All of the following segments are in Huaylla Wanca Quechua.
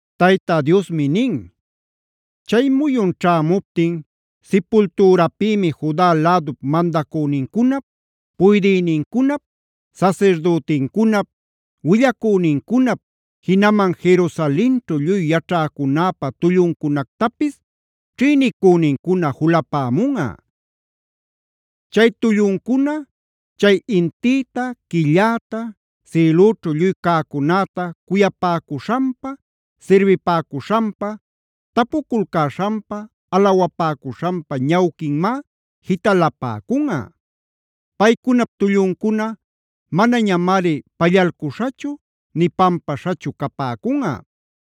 Tayta Diosmi nin: “Chay muyun ćhämuptin sipultürapïmi Juda lädup mandacünincunap, puydïnincunap, sasirdütincunap, willacünincunap, jinaman Jerusalenćhu lluy yaćhäcunäpa tulluncunactapis ćhïnicünincuna julapämunꞌa. Chay tulluncuna chay intïta, quilläta, sïlüćhu lluy cäcunäta cuyapäcuśhanpa, sirbipäcuśhanpa, tapuculcäśhanpa, alawapäcuśhanpa ñawquinmá jitalapäcunꞌa. Paycunap tulluncuna manañamari pallalcuśhachu nï pampaśhachu capäcunꞌa.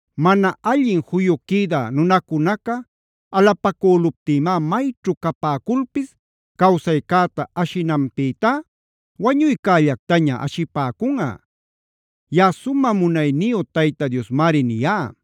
Mana allin juyu quïdä nunacunaca alapacüluptïmá mayćhu capäculpis cawsaycäta ashinanpïtá wañuycällactaña ashipäcunꞌa. Yaꞌa sumä munayniyu Tayta Diosmari niyá.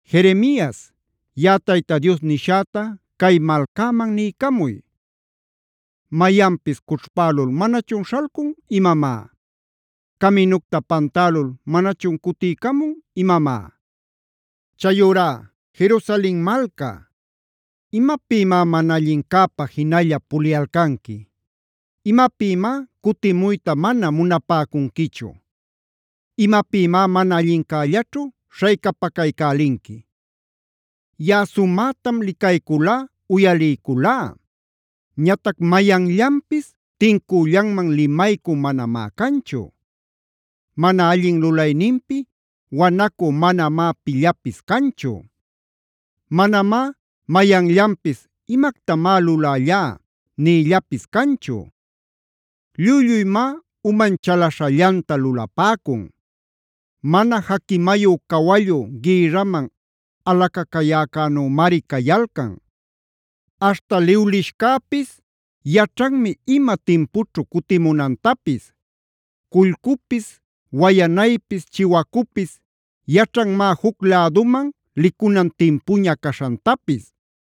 “Jeremias, yaꞌa Tayta Dios nishäta cay malcäman niycamuy: “ ‘Mayanpis ¿cućhpälul manachun śhalcun imamá? ¿Caminucta pantälul manachun cutiycamun imamá? Chayurá Jerusalen malca, ¿imapïmá mana allincäpa jinalla puliyalcanqui? ¿Imapïmá cutimuyta mana munapäcunquichu? ¿Imapïmá mana allincällaćhu śhaycapacaycälinqui? Yaꞌa sumätam licayculá, uyaliyculá; ñatac mayanllapis tincüllanman limaycü manamá canchu. Mana allin lulayninpi wanacü manamá pillapis canchu. Manamá mayanllanpis: “¿Imactamá lulällá?” nïllapis canchu. Lluy-lluymá uman chalaśhallanta lulapäcun; mana jaquimayu cawallu gïrraman alacacayäcänümari cayalcan. Aśhta liwlishcäpis yaćhanmi ima timpućhu cutimunantapis. Cullcupis, wayanaypis, chiwacupis yaćhanmá juc läduman licunan timpuña caśhantapis.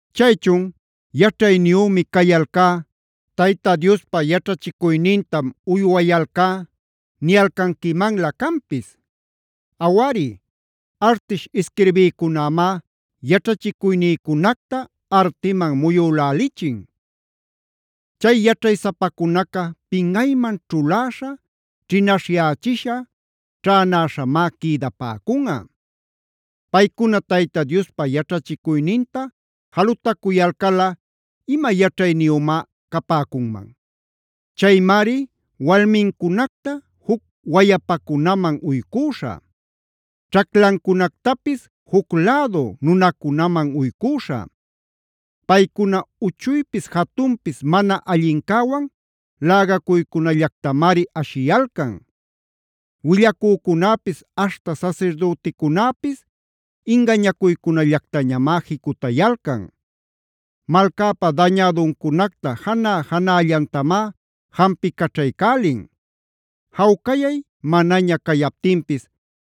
“ ‘Chaychun “¿yaćhayniyümi cayalcá. Tayta Diospa yaćhachicuynintam uywayalcá” niyalcanquimanlä canpis? Awari, artish isquirbïcunämá yaćhachicuynïcunacta artiman muyülälichin. Chay yaćhaysapacunaca pinꞌayman ćhuläśha, ćhinaśhyächisha, ćhänäśhamá quïdapäcunꞌa. Paycuna Tayta Diospa yaćhachicuyninta jalutacuyalcalꞌa, ¿ima yaćhayniyümá capäcunman? Chaymari walmincunacta juc wayapacunaman uycüśhä; ćhaclancunactapis juc lädu nunacunaman uycüśhä. Paycuna uchuypis jatunpis mana allincäwan lägacuycunallactamari ashiyalcan. Willacücunäpis aśhta sasirdüticunäpis ingañacuycällactañamá jicutayalcan. Malcäpa dañäduncunacta janä-janällantamá jampicaćhaycälin. Jawcayay manaña cayaptinpis: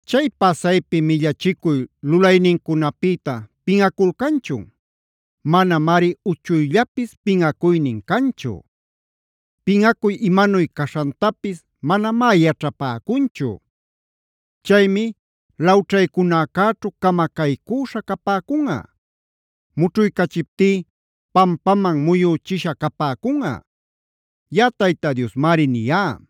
¿Chay pasaypi millachicuy lulaynincunapïta pinꞌaculcanchun? Manamari uchuyllapis pinꞌacuynin canchu; pinꞌacuy imanuy caśhantapis manamá yaćhapäcunchu. Chaymi lawćhaycunäcäćhu camacaycüśha capäcunꞌa; mućhuycachiptí pampaman muyüchisha capäcunꞌa.d Yaꞌa Tayta Diosmari niyá.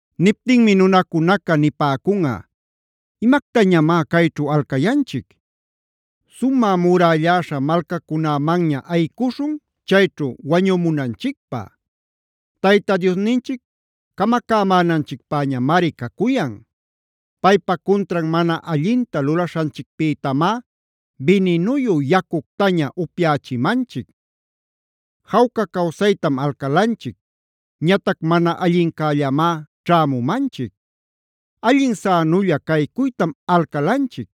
“Niptinmi nunacunaca nipäcunꞌa: ‘¿Imactañamá cayćhu alcayanchic? Sumä murälläśha malcacunämanña ayicuśhun, chayćhu wañumunanchicpä. Tayta Diosninchic camacämänanchicpäñamari cacuyan. Paypa cuntran mana allinta lulaśhanchicpïtamá bininuyu yacuctaña upyächimanchic. Jawca cawsaytam alcalanchic, ñatac mana allincällamá ćhämumanchic. Allin sänulla caycuytam alcalanchic,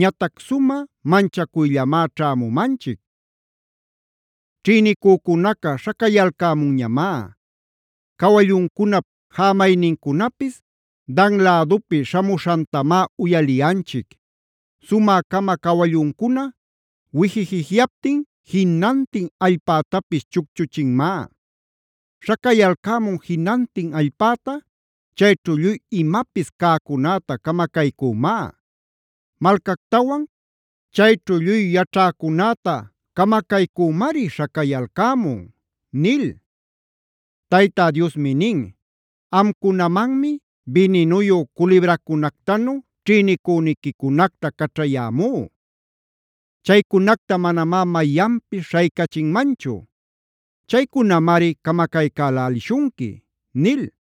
ñatac sumä manchacuyllamá ćhämumanchic. Ćhïnicücunaca śhacayalcämunñamá. Cawalluncunap jämaynincunapis Dan lädupi śhamuśhantamá uyaliyanchic. Sumä-cama cawalluncuna wijijijyaptin jinantin allpätapis chucchuchinmá. Śhacayalcämun jinantin allpäta, chayćhu lluy imapis cäcunäta camacaycümá; malcactawan chayćhu lluy yaćhäcunäta camacaycümari śhacayalcämun’” nil. Tayta Diosmi nin: “Amcunamanmi bininuyu culibracunactanu ćhïnicüniquicunacta caćhayämú. Chaycunacta manamá mayanpis śhaycachinmanchu. Chaycunamari camacaycälälishunqui” nil.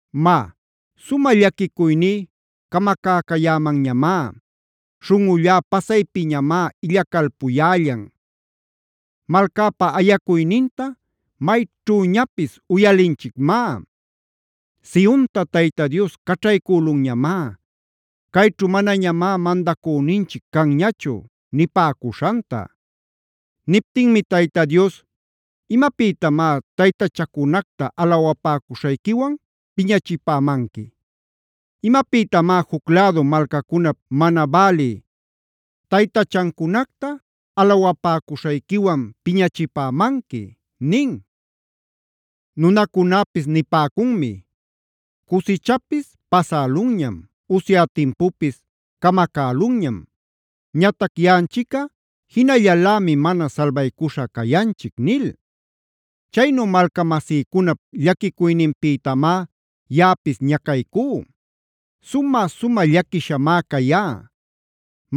Má, sumä llaquicuyní camacäcayämanñamá; śhunꞌullá pasaypiñamá illacalpuyällan. Malcäpa ayacuyninta mayćhüñapis uyalinchicmá: “Sionta Tayta Dios caćhaycülunñamá. Cayćhu manañamá mandacüninchic canñachu” nipäcuśhanta. Niptinmi Tayta Dios: “¿Imapïtamá taytachacunacta alawapäcuśhayquiwan piñachipämanqui? ¿Imapïtamá juc lädu malcacunap mana bälï taytachancunacta alawapäcuśhayquiwan piñachipämanqui?” nin. Nunacunäpis nipäcunmi: “Cusichapis pasälunñam, usya timpupis camacälunñam. Ñatac yaꞌanchicꞌa jinallalämi mana salbaycuśha cayanchic” nil. Chaynu malcamasïcunap llaquicuyninpïtamá yaꞌapis ñacaycú. Sumä-sumä llaquishamá cayá;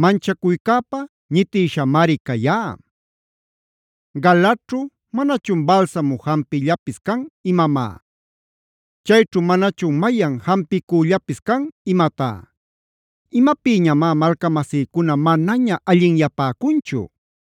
manchacuycäpa ñitïshamari cayá. Galaadćhu ¿manachun balsamu jampillapis can imamá? ¿Chayćhu manachun mayan jampicüllapis can imatá? ¿Imapïñamá malcamasïcuna manaña allinyapäcunchu?